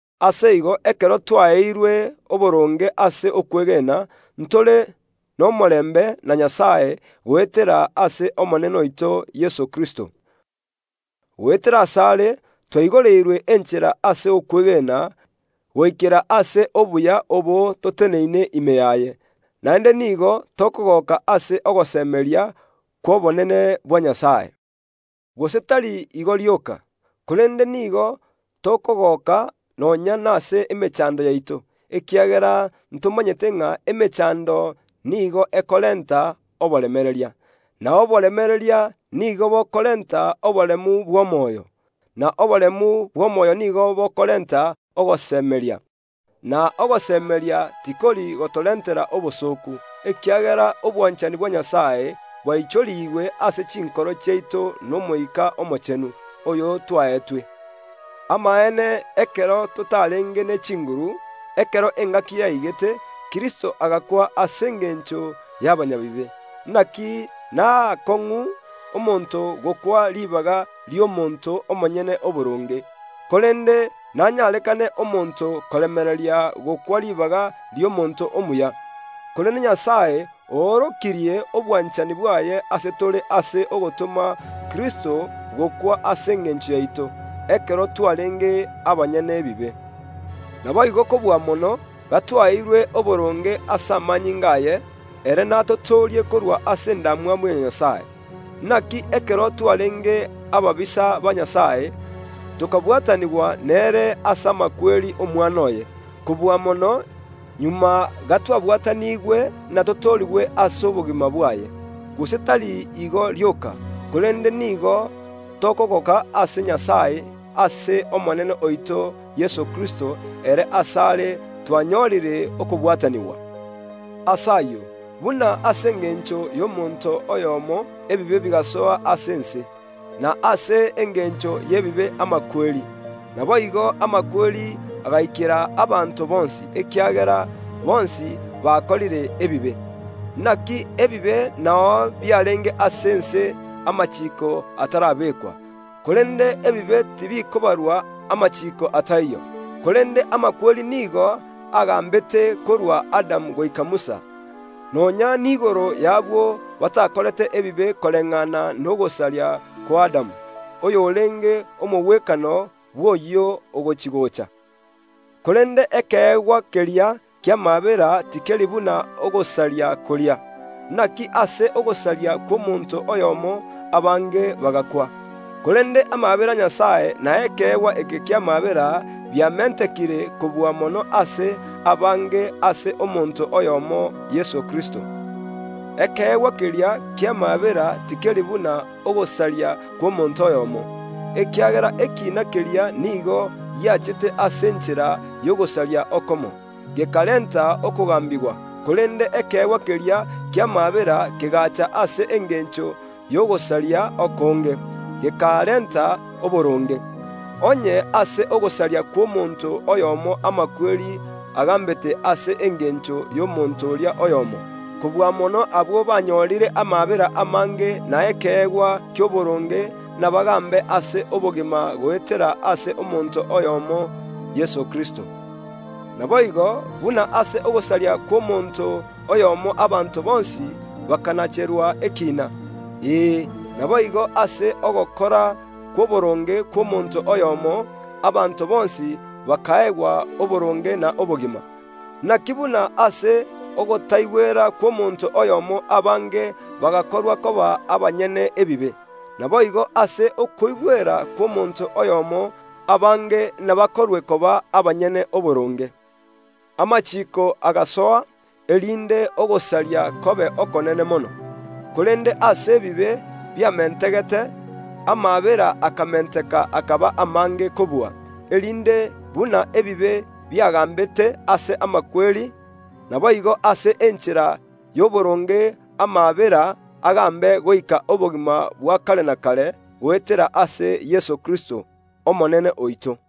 Ase igo ekero twaeirwe oboronge ase okwegena, ntore nomorembe na Nyasae goetera ase Omonene oito Yeso Kristo. Goetera ase are twaigoreirwe enchera ase okwegena goikera ase obuya obo toteneine ime yaye, naende nigo tokogoka ase ogosemeria kw’obonene bwa Nyasae. Gose tari igo rioka, korende nigo tokogoka nonya nase emechando yaito, ekiagera ntomanyete ng’a emechando nigo ekorenta oboremereria; na oboremereria nigo bokorenta oboremu bw’omoyo, na oboremu bw’omoyo nigo bokorenta ogosemeria. Na ogosemeria tikori gotorentera obosooku, ekiagera obwanchani bwa Nyasae bwaichorigwe ase chinkoro chiaito n’Omoika Omochenu, oyo twaetwe. Amaene ekero totarenge ne chinguru, ekero engaki yaigete, Kristo agakwa ase engencho y’abanyabibe. Inaki naakong’u omonto gokwa ribaga ri’omonto omonyene oboronge, korende nenyarekane omonto koremereria gokwa ribaga ri’omonto omuya. Korende Nyasae oorokirie obwanchani bwaye ase tore ase ogotoma Kristo gokwa ase engencho yaito, ekero twarenge abanyene ebibe. Naboigo kobua mono, gatwaeirwe oboronge ase amanyinga aye, ere natotoorie korwa ase endamwamu ya Nyasae. Inaki ekero twarenge ababisa ba Nyasae, tokabwatanigwa nere ase amakweri y’Omwana oye. Kobua mono, magega gatwabwatanigwe natotoorigwe ase obogima bwaye; gose tari igo rioka, korende nigo tokogoka ase Omonene oito Yeso Kristo ere ase are twanyorire okobwatanigwa. Ase ayio, buna ase engencho y’omonto oyomo ebibe bigasoa ase ense, na ase engencho y’ebibe amakweri, naboigo amakweri agaikera abanto bonsi, ekiagera bonsi bakorire ebibe. Inaki ebibe nao biarenge ase ense amachiiko atarabekwa, korende ebibe tibikobarwa amachiiko ataiyo. Korende amakweri nigo agaambete korwa Adamu goika Musa, nonya niigoro y’abwo batakorete ebibe koreng’ana nogosaria kw’Adamu, oyorenge omogwekano bw’oyio ogochi‐gocha. Korende ekeegwa keria ki’amaabera tikeri buna ogosaria koria. Inaki ase ogosaria kw’omonto oyomo abange bagakwa, korende amaabera a Nyasae na ekeegwa eke ki’amaabera biamentekire kobua mono ase abange ase omonto oyomo Yeso Kristo. Ekeegwa keria ki’amaabera tikeri buna ogosaria kw’omonto oyomo, ekiagera ekiina keria nigo giachete ase enchera y’ogosaria okomo, gekarenta okogambigwa, korende ekeegwa keria ki’amaabera kegaacha ase engencho y’ogosaria okonge, gekarenta oboronge. Onye ase ogosaria kw’omonto oyomo amakweri agaambete ase engencho y’omonto oria oyomo, kobua mono abwo banyorire amaabera amange na ekeegwa ki’oboronge nabagaambe ase obogima goetera ase omonto oyomo, Yeso Kristo. Naboigo, buna ase ogosaria kw’omonto oyomo abanto bonsi bakanacherwa ekiina, ee, naboigo ase ogokora kw’oboronge kw’omonto oyomo, abanto bonsi bakaegwa oboronge na obogima. Inaki buna ase ogotaigwera kw’omonto oyomo abange bagakorwa koba abanyene ebibe, naboigo ase okogwa kw’omonto oyomo abange nabakorwe koba abanyene oboronge. Amachiiko agasoa, erinde ogosaria kobe okonene mono. Korende aase ebibe biamentegete, amaabera akamenteka akaba amange kobua, erinde, buna ebibe biagaambete ase amakweri, naboigo ase enchera y’oboronge amaabera agaambe goika obogima bwa kare na kare goetera ase Yeso Kristo, Omonene oito.